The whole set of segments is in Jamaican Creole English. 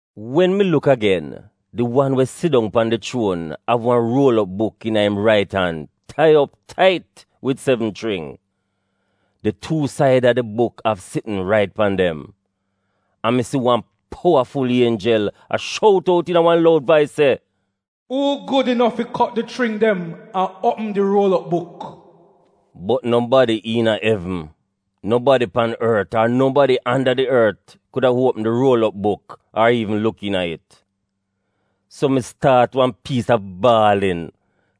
Wen mi luk agen, di wan we sidong pan di chuon av wan ruol op buk iina im rait an tai op tait wid sevn chring. Di tu said a di buk av sitn rait pan dem. An mi si wan powaful ienjel a shout out iina wan loud vais se, “Uu gud inof fi kot di chring dem an uopm di ruol op buk?” Bot nobadi iina evn, nobadi pan ort ar nobadi anda di ort kuda uopm di ruol op buk ar iivn luk iina it. So mi staat wan piisa baalin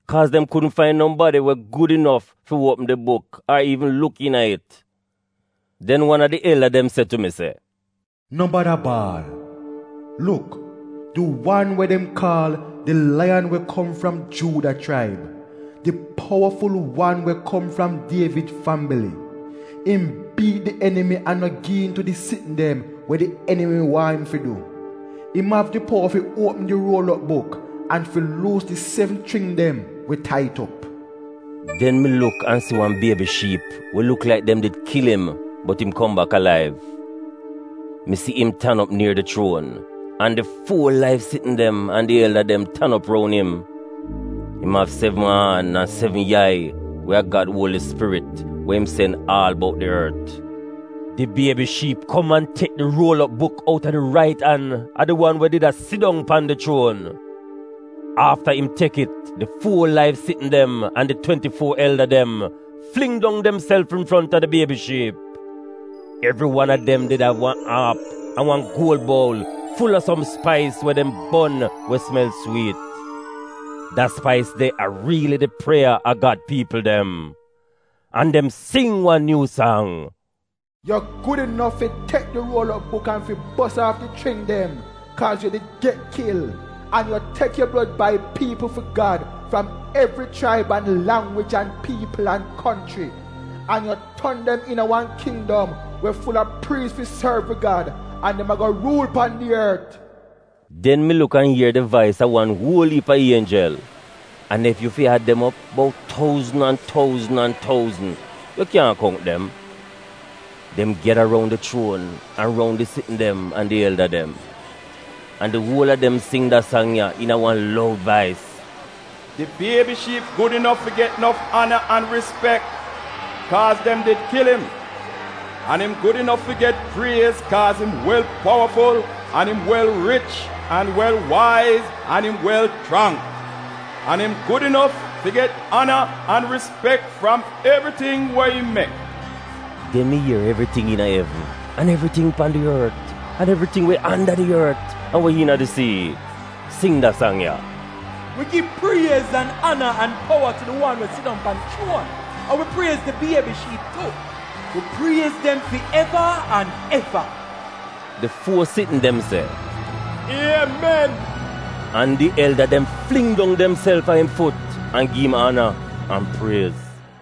kaaz dem kudn fain nobadi we gud inof fi uopm di buk ar iivn luk iina it. Den wan a di elda dem se tu mi, “No bada baal! Luk, di wan we dem kaal di Laiyan we kom fram Juuda Chraib, di powaful wan we kom fram Dievid fambili, im biit di emimi an im no gi iin tu di sitn dem we di enimi waahn im fi du. Im av di powa fi uopm di ruol op buk an fi luus di sevn chring dem we tai it op.” Den mi luk an si wan Biebi Shiip we luk laik dem did kil im bot im kom bak alaiv. Mi si im tan op nier di chuon, an di fuo laiv sitn dem an di elda dem tan op roun im. Im av sevn aan an sevn yai we a Gad Uoli Spirit we im sen aal bout di ort. Di Biebi Shiip kom an tek di ruol op buk outa di rait an a di wan we did a sidong pan di chuon. Afta im tek it, di fuo laiv sitn dem an di twenti-fuo elda dem fling dong demself infronta di Biebi Shiip. Evri wan a dem did av wan aap an wan guol boul ful a som spais we dem bon we sumel swiit. Da spais de a riili di prieya a Gad piipl dem. An dem sing wan nyuu sang: “Yu gud inof fi tek di ruol op buk an fi bos aaf di chring dem, kaaz yu did get kil. An yu tek yu blod bai piipl fi Gad fram evri chraib an langwij an piipl an konchri. An yu ton dem iina wan kindom we ful a priis fi sorv wi Gad, an dem ago ruul pan di ort.” Den mi luk an ier di vais a wan uol iip a ienjel. An ef yu fi ad dem op bout touzn an touzn an touzn — yu kyaahn kount dem. Dem gyada roun di chuon an roun di sitn dem an di elda dem. An di uol a dem sing da sang ya iina wan loud vais: “Di Biebi Shiip gud inof fi get nof ana an rispek, kaaz dem did kil im. Im gud inof fi get priez kaaz im wel powaful an im wel rich an wel waiz an im wel chrang. An im gud inof fi get ana an rispek fram evriting we im mek!” Den mi ier evriting iina evn an evriting pan di ort an evriting we anda di ort an we iina di sii sing da sang ya: “Wi gi priez an ana an powa tu di wan we sidong pan di chuon an wi priez di Biebi Shiip tu. Wi priez dem fi eva an eva!” Di fuo sitn dem se, “Iemen,” an di elda dem fling dong demself a im fut an gi im ana an priez.